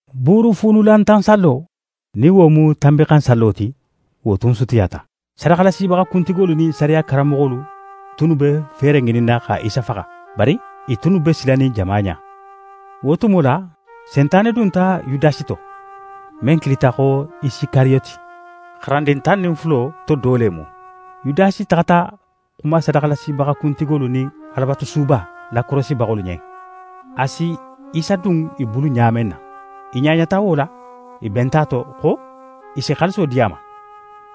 Buurufuunulantan sallo, nin wo mu Tanbinxansallo ti, wo tun sutiyata. Sadaxalasibaxa kuntigolu nin sariya karanmoxolu tunnu be feere ŋininna xa Isa faxa. Bari i tunnu be silanin jama ɲa. Wo tumo la, Sentane dunta Yudasi to, men kilita xo Isikariyoti, xarandin tan nin fulo to do le mu. Yudasi taxata xuma sadaxalasibaxa kuntigolu nin Alabatusuba lakorosibaxolu ɲen, a si Isa dun i bulu ɲa men ma. I ɲaɲata wo la, i benta a to xo i si xaaliso di a ma.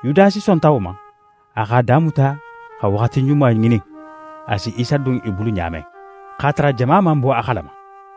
Yudasi sonta wo ma, a x'a damuta xa waxati ɲuma ŋinin a si Isa dun i bulu ɲa men, x'a tara jama man bo a xalama.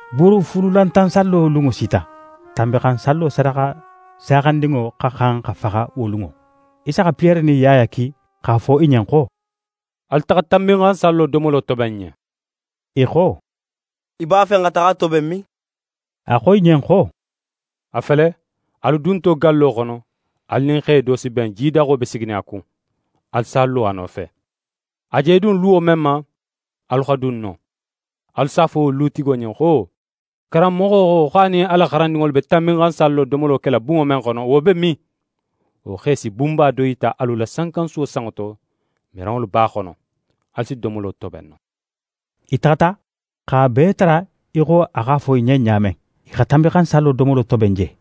Buurufuunulantan sallo lunŋo sita. Tanbinxansallo sadaxa saaxandinŋo xa xan xa faxa wo lunŋo. Isa xa Piyere nin Yaya ki x'a fo i ɲen xo: «Alu taxa Tanbinxansallo domolo toben n ɲen.» I xo: «Í b'a fe n xa taxa a toben min?» A xo i ɲen xo: «A fele, alu dunto gallo xono, alu nin xe do si ben, jidaxo be siginin a kun. Alu s'a lo a nofe. A je dun luwo men ma, alu xa dun non. Alu s'a fo wo lutigo ɲen xo: “Karanmoxo xo, xo a nin a la xarandinŋolu be Tanbinxansallo domolo kela bunŋo men xono, wo be min?” Wo xe si bunba do yita alu la sankansuwo sanŋo to, miranŋolu b'a xono. Alu si domolo toben non.» I taxata, x'a bee tara í xo a x'a fo i ɲen ɲa men. I xa Tanbinxansallo domolo toben je.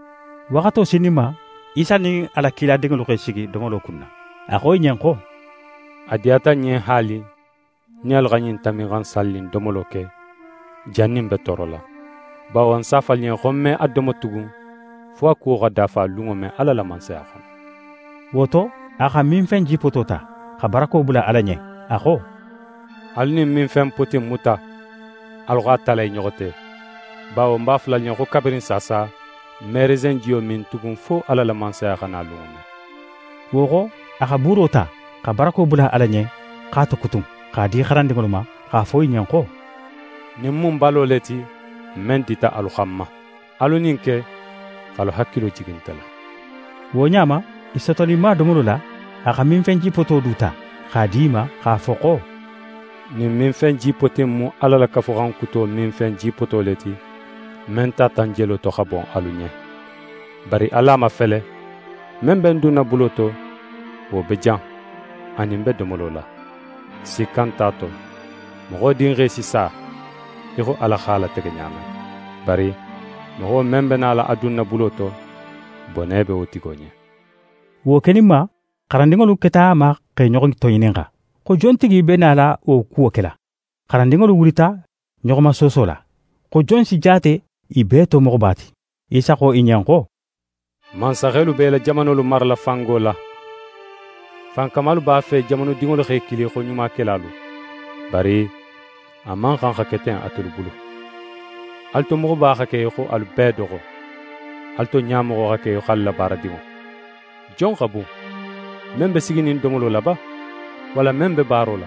Waxato sininma, Isa nin a la kiladinŋolu x'e sigi domolo kunna. A xo i ɲen xo: «A diyata ń ɲen haali, ń nin alu xa ɲin Tanbinxansalli in domolo ke, jannin ń be toorola. Bawo ń s'a fo alu ɲen xo, ń me a domo tugun fo a kuwo xa dafa lunŋo men Ala la Mansaya xono.» Wo to, a xa minfen jipoto ta, xa barako bula Ala ɲen, a xo: «Alu ɲin minfen poti in muta, alu x'a tala i ɲoxo te; bawo ń b'a fola alu ɲen xo, kabirin saasa, ń me resenŋo jiyo min tugun, fo Ala la Mansaya xa na lunŋo men.» Wo xo, a xa buuro ta, xa barako bula Ala ɲen, x'a tokutun, x'a di xarandinŋolu ma, x'a fo i ɲen xo: «Ɲin mu ń balo le ti, men dita alu xanma. Alu ɲin ke x'alu hakilo jigi nte la.» Wo ɲa ma, i sotoninma domolo la, a xa minfen jipoto du ta, x'a di i ma, x'a fo xo: «Ɲin minfen jipoti in mu Ala la Kafuxan Kuto minfen jipoto le ti, men tata ń jelo to, xa bon alu ɲen. Bari alu a mafele: Men be ń dunna bulo to, wo be jan, a nin ń be domolo la! Sikka nte a to, Moxo Dinxe si sa í xo Ala x'a latege ɲa men; bari moxo men be nala a dunna bulo to, bone be wo tigo ɲen!» Wo keninma, xarandinŋolu keta a ma x'e ɲoxo toŋininxa, xo jontigi be nala wo kuwo kela. xarandinŋolu wulita ɲoxomasooso la, xo jon si jaate i bee to moxoba ti. Isa xo i ɲen xo: «Mansaxelu be i la jamanolu marala fango la. Fankamalu b'a fe jamanudinŋolu x'e kili xo ɲumakelalu. Bari a man xan xa ke ten atelu bulu. Alu to moxoba xa ke í xo alu bee doxo; alu to ɲamoxo xa ke í xo alu la baaradinŋo. Jon xa bun? Men be siginin domolo la ba, walla men be baaro la?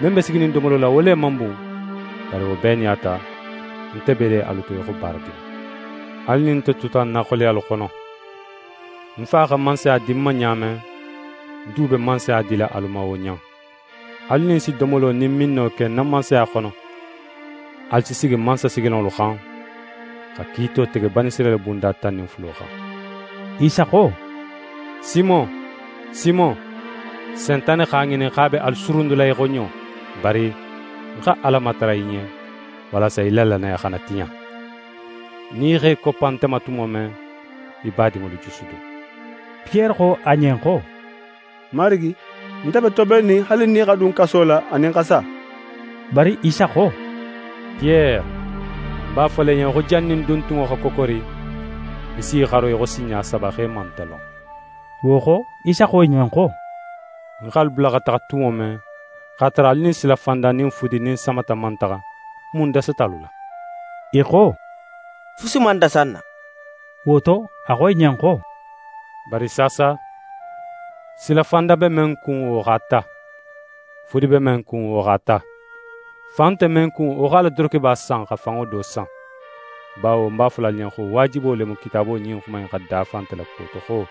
Men be siginin domolo la, wo le man bun? Bari wo bee nin a ta, nte be le alu to í xo baaradinŋo. Alu nin nte tuta ń na xoleyalu xono; Ń Fa xa Mansaya di ń ma ɲa men, ń du be Mansaya dila alu ma wo ɲa in. Alu nin ń si domolo nin minno ke ń na Mansaya xono, alu si sigi mansasigilanŋolu xan, xa kiito tege Banisirayila bunda tan nin fulo xan.» Isa xo: «Simon, Simon! Sentane x'a ŋinin x'a be alu surundula í xo ɲo; bari ń xa Ala matara í ɲen walasa í la lannaya xana tiɲa. Nin í x'é koppa nte ma tumo men, í badinŋolu jusudun.» Piyere xo a ɲen xo: «Marigi, nte be tobennin haali ń nin í xa dun kaso la anin xa sa.» Bari Isa xo: «Piyere, ń b'a fola í ɲen xo, jannin duntunŋo xa kokori, í si í xaro í xo sinɲa saba, xo í man nte lon.» Wo xo, Isa xo i ɲen xo: «Ń x'alu bula xa taxa tumo men, x'a tara alu nin silafanda nin fudi nin samata man taxa, mun dasata alu la?» I xo: «Fusi man dasa n na.» Wo to, a xo i ɲen xo: «Bari saasa silafanda be men kun, wo x'a ta, fudi be men kun, wo x'a ta. Fan nte men kun, wo x'a la dorokeba san xa fanŋo do san. Bawo ń b'a fola alu ɲen xo, waajibo le mu Kitaabo ɲin xuma in xa dafa nte la kuwo to xo: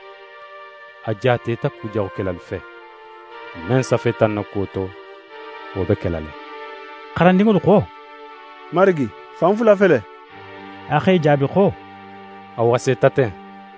“A jaateta kujaxukelalu fe.” Men safeta ń na kuwo to, wo be kela le.» xarandinŋolu xo: «Marigi, fan fula fele.» A x'e jaabi xo: «A waseta ten.»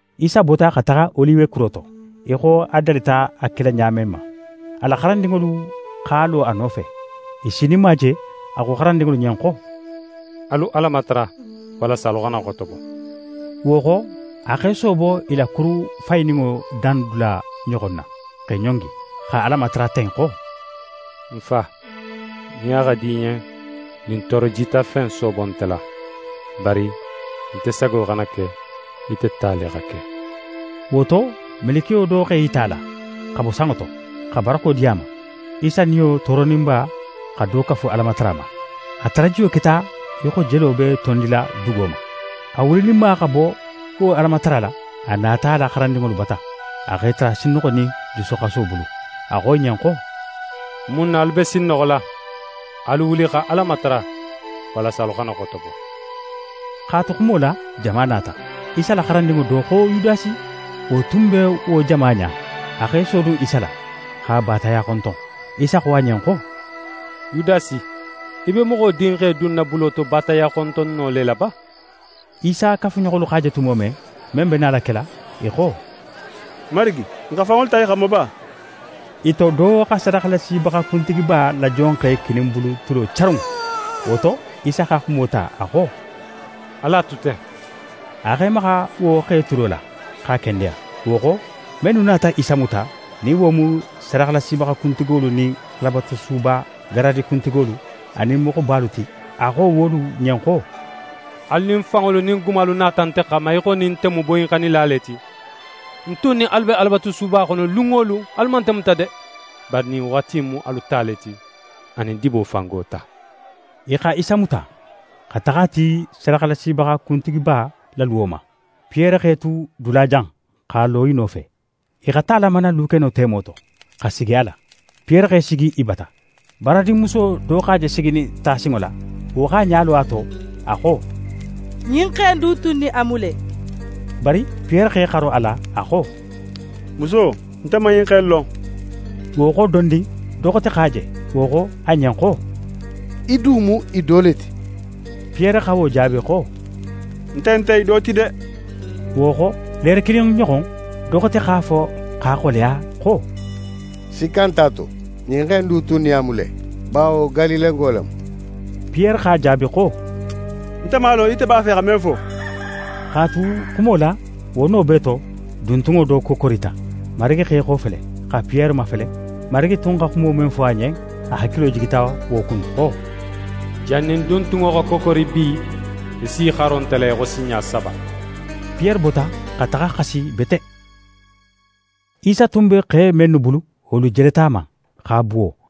Isa bota, xa taxa Oliwe kuro to, í xo a dalita a kela ɲa men ma. A la xarandinŋolu x'a lo a nofe. I sininma je, a xo xarandinŋolu ɲen xo: «Alu Ala matara, walasa alu xana xotobo.» Wo xo, a x'é soobo i la kuru fayininŋo dandula ɲoxon na, x'é ɲongi, xa Ala matara ten xo: «Ń Fa, nin a xa di í ɲen, ɲin tooro jitafe in soobo nte la. Bari nte sago xana ke, ite ta le xa ke.» [ Wo to, melekiyo do x'é yita a la, xa bo sanŋo to, xa barako di a ma. Isa niyo tooroninba xa do kafu Alamatara ma. A tarajiyo keta í xo jelo be tondila dugo ma.] A wulininma xa bo wo Alamatara la, a nata a la xarandinŋolu bata. A x'e tara sinnoxonin jusuxaso bulu. A xo i ɲen xo: «Mun na alu be sinnoxola? Alu wuli xa Ala matara, walasa alu xana xotobo.» X'a tu xumo la, jama nata. Isa la xarandinŋo do, xo Yudasi, wo tun be wo jama ɲa. A x'é sodun Isa la, x'a baataya xonton. Isa xo a ɲen xo: «Yudasi, í be Moxo Dinxe dunna bulo to baataya xontonno le la ba?» Isa kafuɲoxolu x'a je tumo men, men be nala kela, i xo: «Marigi, n xa fanŋolu ta i xanma ba?» I to do xa sadaxalasibaxa kuntigiba la jonxe kininbulu tulo carun. Wo to, Isa xa xumo ta, a xo: «Alu a tu ten.» A x'é maxa wo xe tulo la, x'a kendeya. Wo xo, mennu nata Isa muta, nin wo mu sadaxalasibaxa kuntigolu nin Alabatusuba garadi kuntigolu anin moxobalu ti, a xo wolu ɲen xo: «Alu nin fanŋolu nin gumalu nata nte xanma, í xo nin nte mu boyinxannila le ti. Ń tun nin alu be Alabatusuba xono lun wo lun, alu man nte muta de. Bari ɲin waxati in mu alu ta le ti, anin dibo fango ta.» I xa Isa muta, xa taxa a ti sadaxalasibaxa kuntigiba la luwo ma. Piyere x'é tu dulajan, x'a lo i nofe. I xa ta lamana lukeno temo to, xa sigi a la. Piyere x'é sigi i bata. Baaradinmuso do x'a je siginin tasinŋo la. Wo x'a ɲa lo a to, a xo: «Ɲin xe in du tun nin a mu le!» Bari Piyere x'é xaro a la, a xo: «Muso, nte man ɲin xe in lon.» Wo xo dondin, do xote x'a je. Wo xo a ɲen xo: «Í du mu i do le ti!» Piyere xa wo jaabi xo: «Nte nte i do ti de!» Wo xo, leere kilin ɲoxon, do xote x'a fo x'a xoleya xo: «Sikka nt'a to, ɲin xe in du tun nin a mu le, bawo Galilengo le mu.» Piyere x'a jaabi xo: «Nte man a lon, ite b'a fe xa men fo.» X'a tu xumo la, wo no bee to, duntunŋo do kokorita. Marigi x'é xofele, xa Piyere mafele. Marigi tun xa xumo men fo a ɲen, a hakilo jigita wo kun xo: «Jannin duntunŋo xa kokori bi, í s'í xaro nte la í xo sinɲa saba.» Piyere bota, xa taxa xasi bete. Isa tun be xe mennu bulu, wolu jeleta a ma, x'a buwo.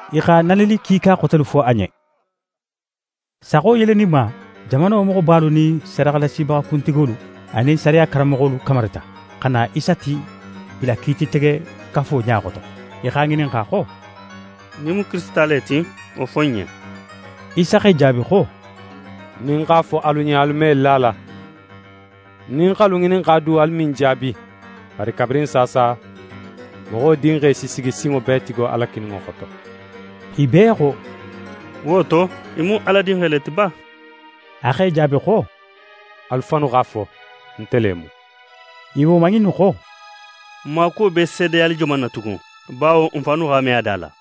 I xa nanili kiika xotelu fo a ɲen. Saxo yeleninma, jamano moxobalu nin sadaxalasibaxa kuntigolu anin sariya karanmoxolu kamarita, xa na Isa ti i la Kiititegekafo ɲa xoto. I x'a ŋininxa xo: «Nin í mu Kirisita le ti, wo fo n ɲen.» Isa x'e jaabi xo: «Nin ń x'a fo alu ɲen, alu me la a la. Nin ń x'alu ŋininxa du, alu me ń jaabi. Bari kabirin saasa, Moxo Dinxe si sigi Sinŋobeetigi Ala kininŋo xoto.» I bee xo: «Wo to, í mu Ala Dinxe le ti ba?» A x'e jaabi xo: «Alu fannu x'a fo, nte le mu.» I woman innu xo: «N maakuwo be seedeyali joman na tugun, bawo n fannu x'a me a da la?»